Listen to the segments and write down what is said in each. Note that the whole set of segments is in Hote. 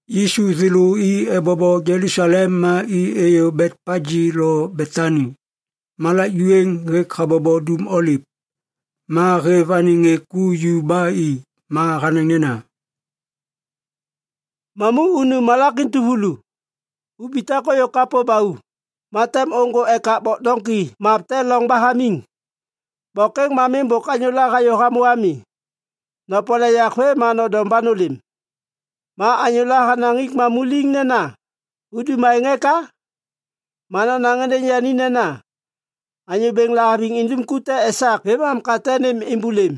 Yisu thêlô i ebobo Jelusalem ma i êyô Betpagi lo Betani, malak ju êŋ hêk habobo Dum Oliv. Ma hêv anêŋ ŋê ku ju ba i ma hanaŋ nena, “Mamu unu malak entuvulu. Ubitak ôyô kapô ba u, ma tem ôŋgô ekak bok doŋki map te loŋ ba hamiŋ. Bok êŋ ma miŋ bôk anyôla hayô hamô ami. Nopole yak vê ma nondom ba nôlêm. Ma anyôla hanaŋ hik mamu liŋ nena, ‘Udum aêŋ eka?’ ma nonaŋ êndêŋ yani nena, ‘Anyô Bêŋ lahaviŋ idum ku te esak vêmam, ka tem nêm êmbôlêm.’”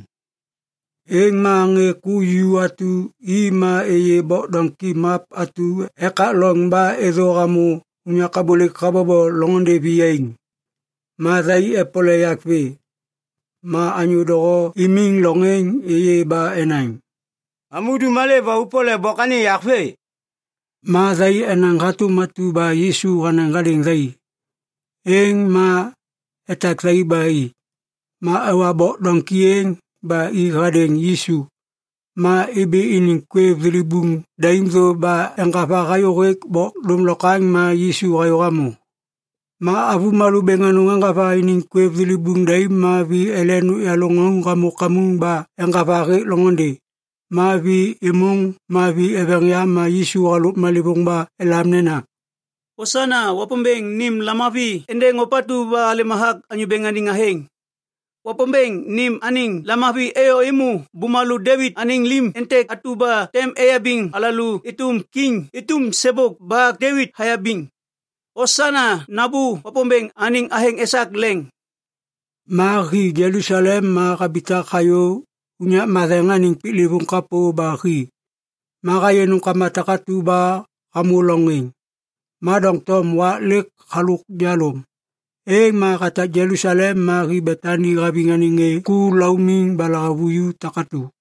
Êŋ ma ŋê ku ju atu i ma êyê bok doŋki map atu ekak loŋ ba êthô hamô unyak abôlêk habobo loŋôndê viyaiŋ. Ma thai epole yak vê. Ma anyô doho imiŋ loŋ êŋ êyê ba enaŋ, “Mamu udum malê ba opole bok anêŋ yak vê?” Ma thai enaŋ hatôm atu ba Yisu hanaŋ hadêŋ thai. Êŋ ma etak thai ba i. Ma ewa bok doŋki êŋ ba i hadêŋ Yisu, ma ibi iniŋ kwêv thilibuŋ daim thô ba eŋgava hayôhêk bok dômlokwaŋ ma Yisu hayô hamô. Ma avômalô bêŋ anôŋ eŋgava iniŋ kwêv thilibuŋ daim ma vi ele nôkyalô ŋauŋ hamô kamuŋ ba eŋgava hêk loŋôndê. Ma vi êmôŋ ma vi eveŋ yam ma Yisu halôk malêvôŋ ba elam nena, “Osana!” “Wapômbêŋ nêm lamavi êndêŋ ôpatu ba halêm hathak Anyô Bêŋ anêŋ athêŋ!” “Wapômbêŋ nêm anêŋ lamavi êyô êmô bumalô Devit anêŋ lim êntêk atu ba tem eyabiŋ alalô êtôm kiŋ êtôm sêbôk ba Devit hayabiŋ! Osana! Nambô Wapômbêŋ anêŋ athêŋ esak leŋ!” Ma hi Jelusalem ma habitak hayô unyak matheŋ anêŋ piklêvôŋ kapô ba hi. Ma hayê nômkama takatu ba hamô loŋ êŋ. Ma doŋtom wak lêk halôk jalôm, êŋ ma hatak Jelusalem ma hi Betani haviŋ anêŋ ŋê ku laumiŋ ba lahavuju takatu.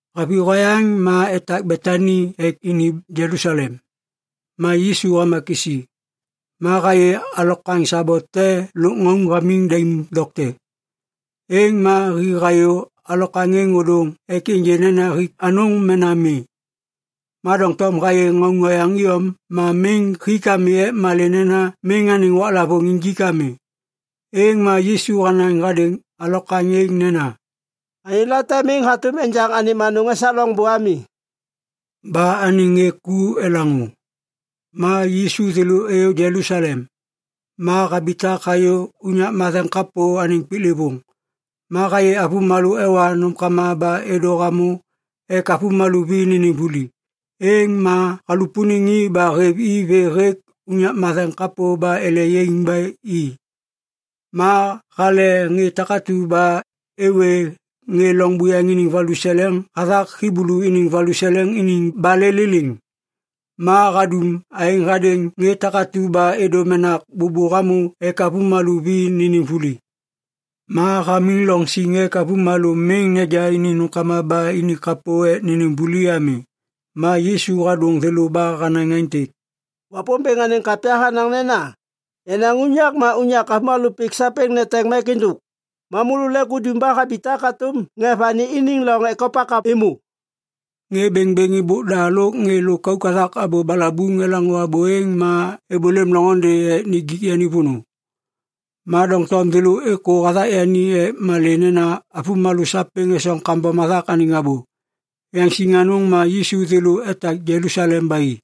Haviyô hayaŋ ma etak Betani ek ini Jelusalem. Ma Yisu hama kisi. Ma hayê alokwaŋ sabo te lôk ŋauŋ hamiŋ daim dokte. Êŋ ma hi hayô alokwaŋ êŋ ôdôŋ ek ênjê nena hik anôŋ mena mi. Ma doŋtom hayê ŋauŋ oyaŋ iyom ma miŋ hik ami ek malê nena miŋ anêŋ waklavôŋ injik ami. Êŋ ma Yisu hanaŋ hadêŋ alokwaŋ êŋ nena, “Anyô late miŋ hatôm enjaŋ anêm anôŋ esak loŋbô ami.” Ba anêŋ ŋê ku elaŋô. Ma Yisu thêlô êyô Jelusalem. Ma habitak hayô unyak matheŋ kapô anêŋ piklêvôŋ. Ma hayê avômalô ewa nômkama ba êdô hamô ek avômalô vi nênêm vuli. Êŋ ma halupuniŋ i ba hêv i vê hêk unyak matheŋ kapô ba ele yaiŋ ba i. Ma hale ŋê takatu ba êwê ŋê loŋ buyaŋ iniŋ valuseleŋ hathak Hiblu iniŋ valuseleŋ iniŋ balê liliŋ. Ma hadum aêŋ hadêŋ ŋê takatu ba êdô menak bôbô hamô ek avômalô vi nênêm vuli. Ma hamiŋ loŋ siŋ ek avômalô miŋ neja iniŋ nômkama ba ini kapô ek nênêm vuli ami. Ma Yisu hadôŋ thêlô ba hanaŋ aêntêk, “Wapômbêŋ anêŋ kapya hanaŋ nena, ‘Yenaŋ unyak ma unyak avômalô pik sapêŋ neteŋ mek êndôk.’ Ma môlô lêk udum ba habitak hatôm ŋê vani iniŋ loŋ ekopak êmô.” Ŋê bêŋbêŋ êbôk da lôk ŋê lôkauk hathak abô balabuŋ elaŋô abô êŋ ma êbôlêm loŋôndê ek nijik yani vônô. Ma doŋtom thêlô êkô hathak yani ek malê nena avômalô sapêŋ esoŋ kambom hathak anêŋ abô. Yaŋsiŋ anôŋ ma Yisu thêlô etak Jelusalem ba i.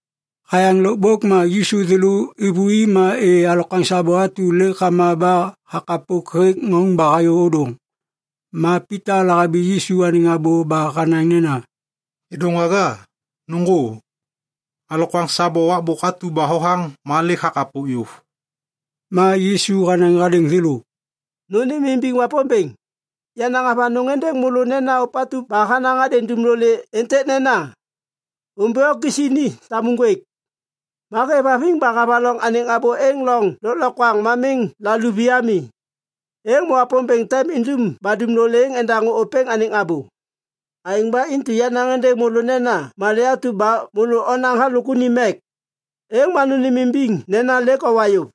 Hayaŋ lôkbôk ma Yisu thêlô êvôi ma êyê alokwaŋ sabo atu lêk hama ba hakapok hêk ŋauŋ ba hayô ôdôŋ. Ma Pita lahabi Yisu anêŋ abô ba hanaŋ nena, “Kêdôŋwaga, nôŋgô! Alokwaŋ sabo wakbôk atu ba hothaŋ ma lêk hakapok yôv.” Ma Yisu hanaŋ hadêŋ thêlô, “Nônêmimbiŋ Wapômbêŋ. Yanaŋ avanôŋ êndêŋ môlô nena ôpatu ba hanaŋ hadêŋ dumlolê êntêk nena, ‘Ômbi o kisi ni tamu ŋgwêk’, ma hêvhaviŋ ba havaloŋ anêŋ abô êŋ loŋ lôklokwaŋ ma miŋ laluvi ami, êŋ ma Wapômbêŋ tem indum ba dumlolê êŋ endaŋô ôpêŋ anêŋ abô. Aêŋ ba intu yanaŋ êndêŋ môlô nena malê atu ba môlô onaŋ halôk unim mek, êŋ ma nônêmimbiŋ nena lêk owa yôv,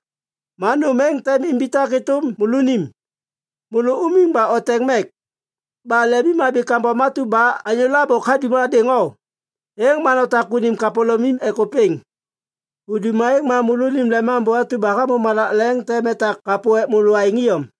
ma nôm êŋ tem imbitak êtôm môlônim. Môlô umiŋ ba oteŋ mek, ba lemimhabi kambom atu ba anyôla bôk hadum hadêŋ o, êŋ ma notak unim kapôlômim ek ôpêŋ. Udum aêŋ ma môlônim Lemambô atu ba hamô malak leŋ tem etak kapô ek môlô aêŋ iyom.”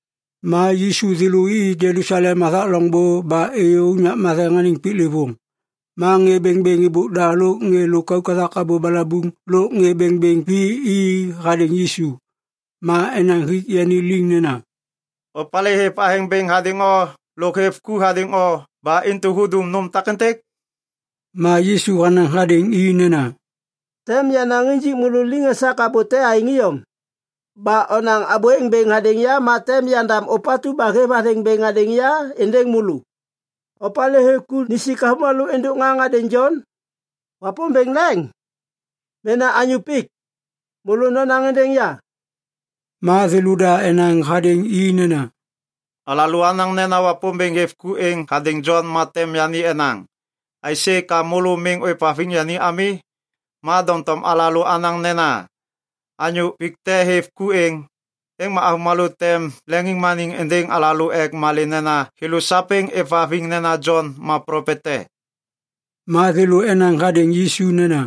Ma Yisu thêlô i Jelusalem hathak loŋbô ba êyô unyak matheŋ anêŋ piklêvôŋ. Ma ŋê bêŋbêŋ êbôk da lôk ŋê lôkauk hathak abô balabuŋ lôk ŋê bêŋbêŋ vi i hadêŋ Yisu. Ma enaŋ hik yani liŋ nena, “Opalê hêv athêŋ bêŋ hadêŋ o lôk hêv ku hadêŋ o ba intu hudum nôm takêntêk?” Ma Yisu hanaŋ hadêŋ i nena, “Tem yanaŋ injik môlô liŋ esak abô te aêŋ iyom. Ba onaŋ abô êŋ bêŋ hadêŋ ya ma tem yandam ôpatu ba hêv athêŋ bêŋ hadêŋ ya êndêŋ môlô. Opalê hêv ku nisik avômalô êndôk ŋaŋ hadêŋ Jon? Wapômbêŋ leŋ? Mena anyô pik? Môlô nonaŋ êndêŋ ya!” Ma thêlôda enaŋ hadêŋ i nena, “Alalô anaŋ nena Wapômbêŋ hêv ku êŋ hadêŋ Jon ma tem yani enaŋ, ‘Aisê ka môlô miŋ ôêvhaviŋ yani ami?’ Ma doŋtom alalô anaŋ nena, ‘Anyô pik te hêv ku êŋ,’ êŋ ma avômalô tem leŋiŋmaniŋ êndêŋ alalô. Ek malê nena thêlô sapêŋ êvhaviŋ nena Jon ma plopet te.” Ma thêlô enaŋ hadêŋ Yisu nena,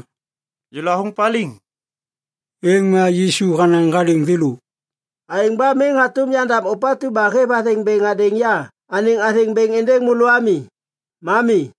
“Yêlô athôŋ paliŋ.” Êŋ ma Yisu hanaŋ hadêŋ thêlô, “Aêŋ ba miŋ hatôm yandam ôpatu ba hêv athêŋ bêŋ hadêŋ ya anêŋ athêŋ bêŋ êndêŋ môlô ami. Ma mi.”